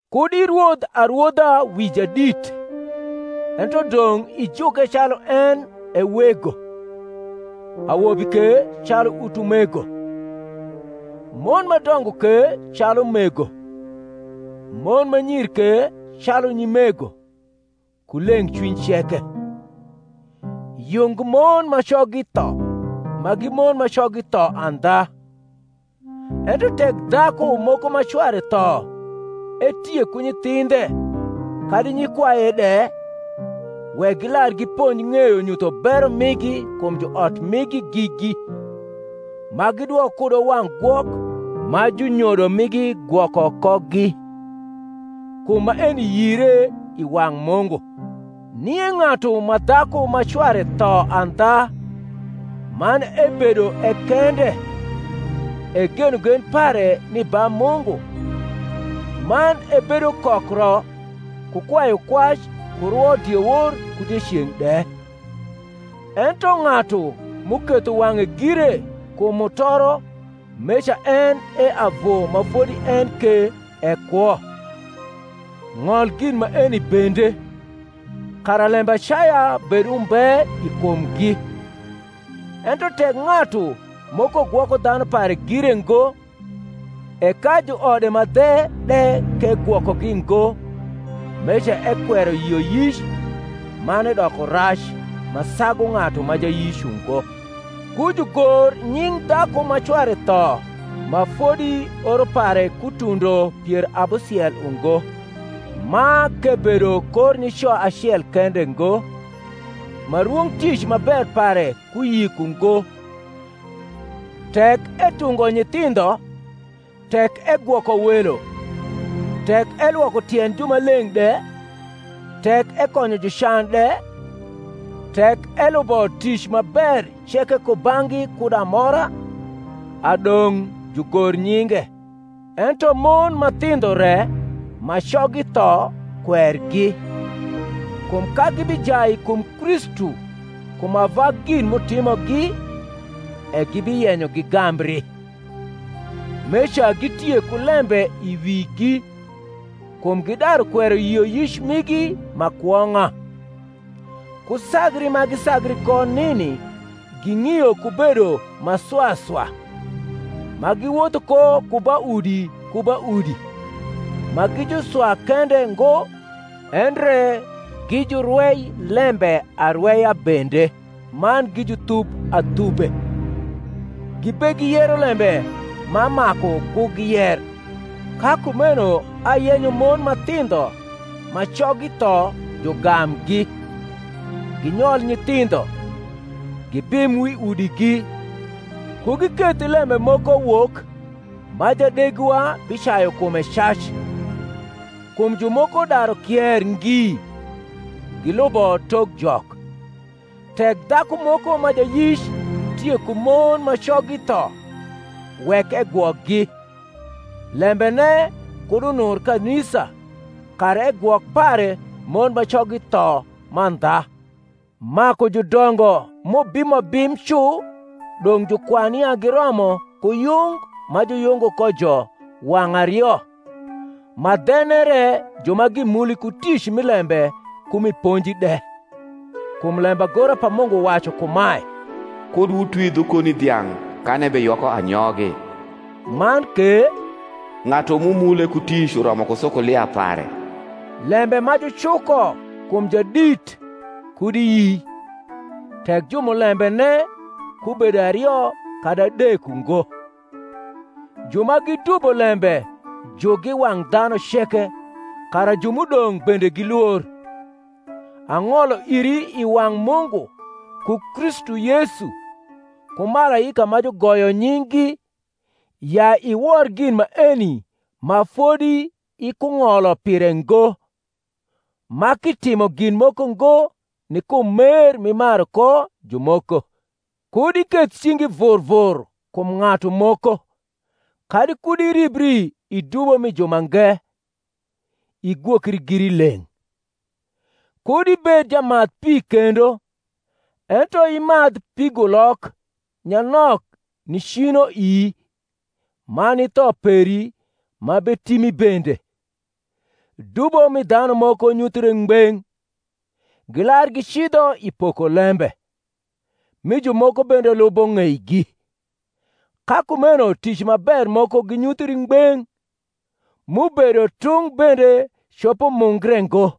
Kud irwodh arwodha wi jadit, ento dong’ ijuke calu en e wego; awobi ke calu utumego: mon ma dongo ke calu mego; mon ma nyir ke calu nyimego, ku leng’cwiny ceke. Yung mon ma coggi tho ma gi mon ma coggi tho andha. Ento tek dhaku moko ma cware tho etie ku nyithindhe kadi nyikwaye de, wek gilar giponj ng’eyo nyutho bero migi kum juot migi gigi, ma gidwok kudo wang’ gwok ma junyodo migi gwoko kogi: kum maeni yire i wang’ Mungu. Nie ng’atu ma dhaku ma cware tho andha, man ebedo e kende, e genogen pare ni ba Mungu, man ebedo kokro ku kwayukwac ku rwo diewor ku dieceng’ de. Ento ng’atu m’uketho wang’e gire kum mutoro meca en e avu ma fodi en ke e kwo. Ng’ol gin maeni bende, kara lembacaya bed umbe i kumgi. Ento tek ng’atu moko gwoko dhanu pare gire ngo, e ka juode ma dhe de k’egwokogi ngo, meca ekwero yioyic, man edoko rac ma sagu ng’atu ma jayic ungo. Ku jugor nying dhaku ma cware tho ma fodi oro pare ku tundo pier abusiel ungo, ma k’ebedo kor nico acel kende ngo, ma rwong tic ma ber pare ku yik ungo; tek etungo nyithindho, tek egwoko welo, tek elwoko tiend jumaleng’ de, tek ekonyo jucan de, tek elubo tic ma ber ceke kubang’gi kud amora, a dong’ jugor nyinge. Ento mon ma thindho re ma coggi tho kwergi: kum ka gibijai kum Kristu kum ava gin m’utimogi, e gibiyenyo gigambri; meca gitie ku lembe i wigi, kum gidaru kwero yioyic migi ma kwong’a. Ku sagri ma gisagri ko nini ging’io ku bedo ma swa swa, ma giwotho ko ku ba udi ku ba udi; ma gi juswa kende ngo, endre gi jurwei lembe arweya bende man gi juthub athube, gibegiyero lembe ma maku ku giyer. Ka kumeno ayenyo mon ma thindho ma coggi tho jugamgi, ginyol nyithindho, gibim wi udigi, ku giketh lembe moko wok ma jadegiwa bicayu kume cac: kum jumoko daru kier ngi gilubo tok Jok. Tek dhaku moko ma jayic tie ku mon ma coggi tho, wek egwokgi, lembene kud unur kanisa; kara egwok pare mon ma coggi tho mandha. Maku judongo m’ubimo bim cu dong’ jukwan ya giromo ku yung ma juyungo kojo wang’ ario, ma dhene re ju ma gimuli ku tic mi lembe ku mi ponji de. Kum lembagora pa Mungu wacu kumae, Kud wutwi dhu koni dhiang’ kan ebeyoko anyogi. Man ke, Ng’atu m’umule ku tic uromo ku sukulia pare. Lembe ma jucuko kum jadit kud iyi, tek jumulembene kubedo ario kadi adek ungo. Ju ma gidubo lembe jukgi i wang’ dhanu ceke, kara ju m’udong’ bende gilwor. Ang’olo iri i wang’ Mungu, ku Kristu Yesu, ku malaika ma jugoyo nying’gi, ya iwor gin maeni ma fodi ikung’olo pire ngo, ma k’itimo gin moko ngo ni kum mer m’imaru ko jumoko. Kud iketh cingi vur vur kum ng’atu moko, kadi kud iribri i dubo mi jumange: igwokri giri leng’. Kud ibed jamadh pi kendo, ento imadh pigulok nyanok ni cino ii man ni tho peri ma betimi bende. Dubo mi dhanu moko nyuthre ngbeng’, gilar gicidho i poko lembe; mi jumoko bende lubo ng’eigi. Ka kumeno tic ma ber moko ginyuthri ngbeng’: m’ubedo tung’ bende copo mungre ngo.